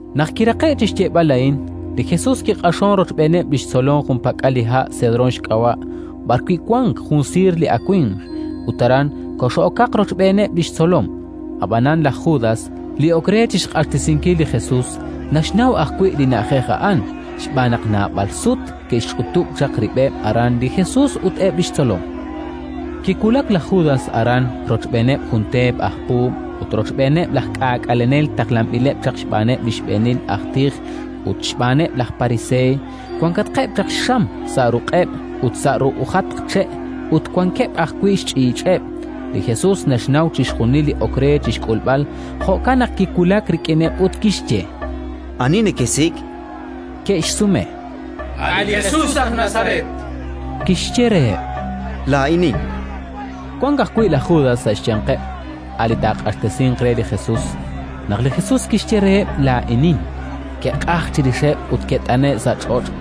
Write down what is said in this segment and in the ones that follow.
Naq kiraqe'k chi xyeeb'al a'in, li Jesus kiq'axonk rochb'eeneb' li xtzolom junpak'al li ha' Sedrón xk'ab'a', b'arwi' wank jun siir li awimq; ut aran kox'okaq rochb'eeneb' li xtzolom. Ab'anan laj Judas, li ok re chi xq'axtesinkil li Jesus, naxnaw ajwi' li na'ajej a'an, xb'aan naq naab'al sut ke'xch'utub' chaq rib'eb' aran li Jesus ut eb' li xtzolom. Kiwulak laj Judas aran rochb'eeneb' jun teepeb' aj puub' ut rochb'eeneb' laj k'aak'alenel taqlanb'ileb' chaq xb'aaneb' li xb'eenil aj tij ut xb'aaneb' laj Pariseey. Wankatqeb' chaq xxam sa' ruq'eb' ut sa' ru'ujatq che', ut wankeb' ajwi' xch'iich'eb'. Li Jesus naxnaw chixjunil li ok re chi xk'ulb'al; jo'kan naq kiwulak rik'ineb' ut kixye: —Ani nekesik'? Ke'xsume: —A' li Jesus aj Nazaret, chankeb'. Kixye reheb': —Laa'inin. Wank ajwi' laj Judas sa' xyanqeb', a' li taaq'axtesinq re li Jesus. Naq li Jesus kixye reheb': “Laa'inin”, ke'q'ajk chirixeb' ut ke't'ane'k sa' ch'och'.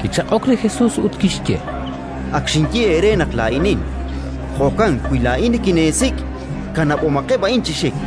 Kichaq'ok li Jesus ut kixye: —Ak xinye eere naq laa'inin; jo'kan wi laa'in nikineesik', kanab'omaqeb' a'in chi xik.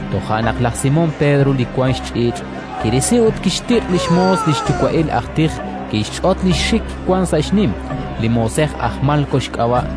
Toja' naq laj Simón Pedro li wank xch'iich', kirisi ut kixtiq' li xmoos li xyuwa'il aj tij: kixch'ot li xxik wank sa' xnim. Li moosej a'an aj Malko xk'ab'a'.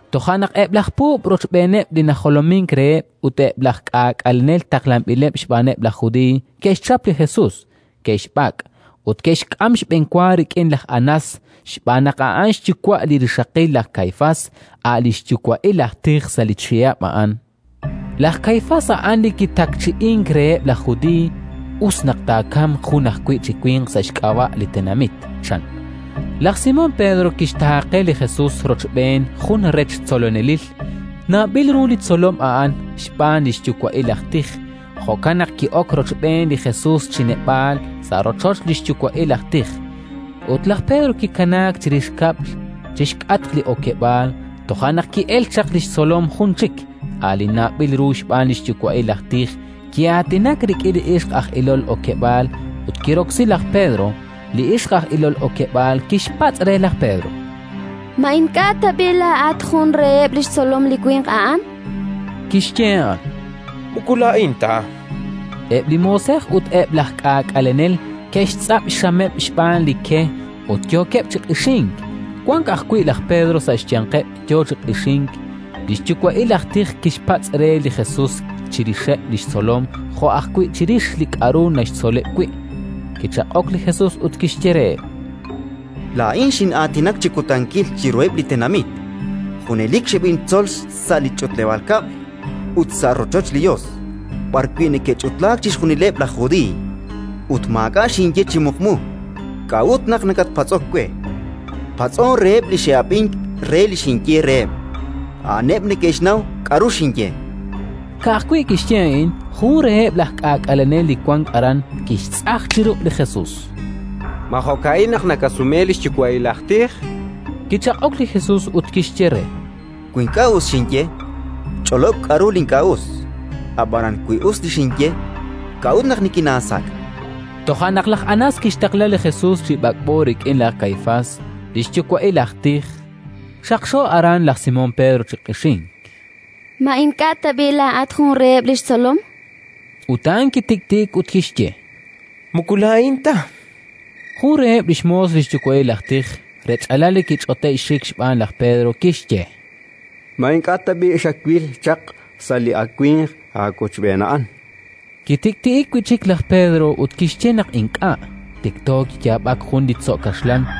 Toja' naq eb' laj puub' rochb'eeneb' li najolomink reheb' ut eb' laj k'aak'alenel taqlanb'ileb' xb'aaneb' laj Judiiy ke'xchap li Jesus, ke'xb'ak' ut ke'xk'am xb'enwa rik'in laj Anás xb'aan naq a'an xyuwa' li rixaqil laj Kaifás, a' li xyuwa'il aj tij sa' li chihab' a'an. Laj Kaifás a'an li kitakchi'ink reheb' laj Judiiy: “Us naq taakamq jun ajwi' chi winq sa' xk'ab'a' li tenamit”, chan. Laj Simón Pedro kixtaaqe li Jesus rochb'een jun rech tzolonelil. A'an li apóstol San Jwan. Nawb'il ru li tzolom a'an xb'aan li xyuwa'il aj tij, jo'kan naq ki'ok rochb'een li Jesus chi neb'aal, sa' rochoch li xyuwa'il aj tij; ut laj Pedro kikanaak chirix kab'l, chi xk'atq li okeb'aal. Toja' naq ki'elk chaq li tzolom jun chik, a' li nawb'il ru xb'aan li xyuwa'il aj tij, ki'aatinak rik'in li ixq aj ilol okeb'aal, ut kiroksi laj Pedro. Li ixq aj ilol okeb'aal kixpatz' re laj Pedro: —Ma ink'a' tab'i' laa'at jun reheb' li xtzolom li winq a'an? chan. Kixye a'an: —Moko laa'in ta. Eb' li moosej ut eb' laj k'aak'alenel ke'xtz'ab' xxameb' xb'aan li ke ut yookeb' chi q'ixink. Wank ajwi' laj Pedro sa' xyanqeb', yo chi q'ixink. Li xyuwa'il aj tij kixpatz' re li Jesus chirixeb' li xtzolom jo' ajwi' chirix li k'aru naxtzoleb' wi'. Kichaq'ok li Jesus ut kixye reheb': —Laa'in xin'aatinak chi kutankil chiruheb' li tenamit; junelik xeb'intzol sa' li ch'utleb'aal kab'l ut sa' rochoch li Yos, b'arwi' neke'ch'utlaak chixjunileb' laj Judiiy, ut maak'a' xinye chi muqmu. K'a'ut naq nakatpatz'ok we? Patz'on reheb' li xe'ab'ink re li xinye reheb'. A'aneb' neke'xnaw k'aru xinye. Ka'ajwi' kixye a'in, jun reheb' laj k'aak'alenel li wank aran, kixtz'aj chi ruq' li Jesus: —Ma jo'ka'in naq nakasume li xyuwa'il aj tij? chan. Kichaq'ok li Jesus ut kixye re: —Wi ink'a' us xinye, ch'olob' k'aru li ink'a' us; ab'anan wi us li xinye, k'a'ut naq nikinaasak'? Toja' naq laj Anás kixtaqla li Jesus chi b'ak'b'o rik'in laj Kaifás, li xyuwa'il aj tij. Xaqxo aran laj Simón Pedro chi q'ixink: —Ma ink'a' tab'i' laa'at jun reheb' li xtzolom? chu'uxk re. Ut a'an kitik'ti'ik ut kixye: —Moko laa'in ta. Jun reheb' li xmoos li xyuwa'il aj tij, rech'alal li kich'ote'k xxik xb'aan laj Pedro, kixye: —Ma ink'a' tab'i' xatwil chaq sa' li awimq aawochb'een a'an? Kitik'ti'ik wi' chik laj Pedro ut kixye naq ink'a'. Tikto kiyaab'ak jun li tzo' kaxlan.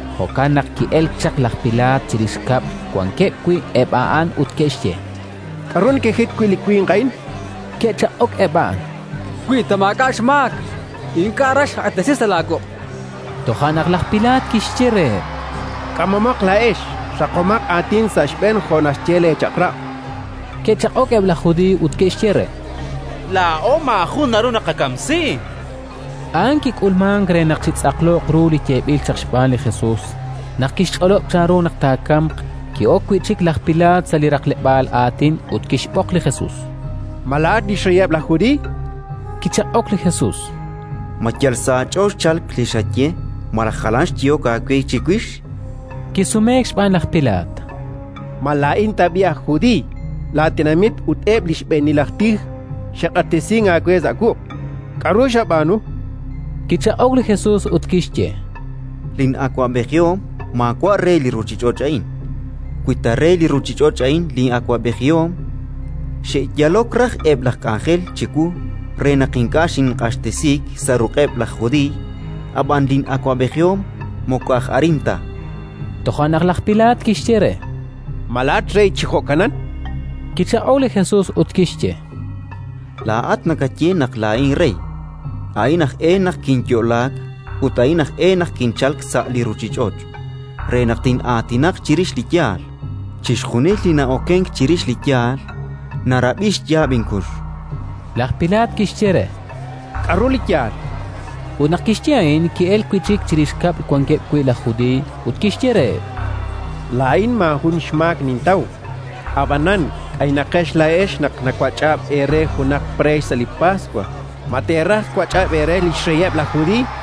Jo'kan naq ki'elk chaq laj Pilaat chirix kab'l wankeb' wi' eb' a'an ut kixye: —K'aru nekejit wi' li winq a'in? Ke'chaq'ok eb' a'an: —Wi ta maak'a' xmaak, ink'a' raj xqaq'axtesi sa' laawuq', chankeb' re. Toja' naq laj Pilaat kixye reheb': —K'amomaq laa'ex ut raqomaq aatin sa' xb'een jo' naxye leechaq'rab'. Ke'chaq'ok eb' laj Judiiy ut ke'xye re: —Laa'o maajun naru naqakamsi. A'an kik'ulmank re naq chitz'aqloq ru li yeeb'il chaq xb'aan li Jesus, naq kixch'olob' chanru naq taakamq. Ki'ok wi' chik laj Pilaat sa' li raqleb'aal aatin ut kixb'oq li Jesus: —Ma laa'at li xreyeb' laj Judiiy? chan re. Kichaq'ok li Jesus: —Ma yal sa' aach'ool xchalk li xaye malaj jalan xyehok aawe chiwix? Kisumeek xb'aan laj Pilaat: —Ma laa'in tab'i' aj Judiiy? Laatenamit ut eb' li xb'eenil aj tij xe'q'axtesink aawe sa' wuq'. K'aru xab'aanu? Kichaq'ok li Jesus ut kixye: —Lin'awab'ejihom maawa' re li ruuchich'och' a'in. Wi ta re li ruuchich'och' a'in lin'awab'ejihom, xe'yalok raj eb' laj k'anjel chiwu re naq ink'a' xinq'axtesiik sa' ruq'eb' laj Judiiy; ab'anan lin'awab'ejihom moko aj arin ta. Toja' naq laj Pilaat kixye re: —Ma laa'at rey chi jo'kanan? Kichaq'ok li Jesus ut kixye: —Laa'at nakaye naq laa'in rey. A'in aj e naq kinyo'laak ut a'in aj e naq kinchalk sa' li ruuchich'och': re tin'aatinaq chirix li yaal. Chixjunil li na'okenk chirix li yaal, narab'i li xyaab' inkux. Laj Pilaat kixye re: —K'aru li yaal? Ut naq kixye a'in, ki'elk wi' chik chirix kab'l wankeb' wi' laj Judiiy ut kixye reheb': —Laa'in maajun xmaak nintaw. Ab'anan k'aynaqex laa'ex naq nawach'ab' eere junaq preex sa' li Paswa. Ma teeraj twach'ab' eere li xreyeb' laj Judiiy?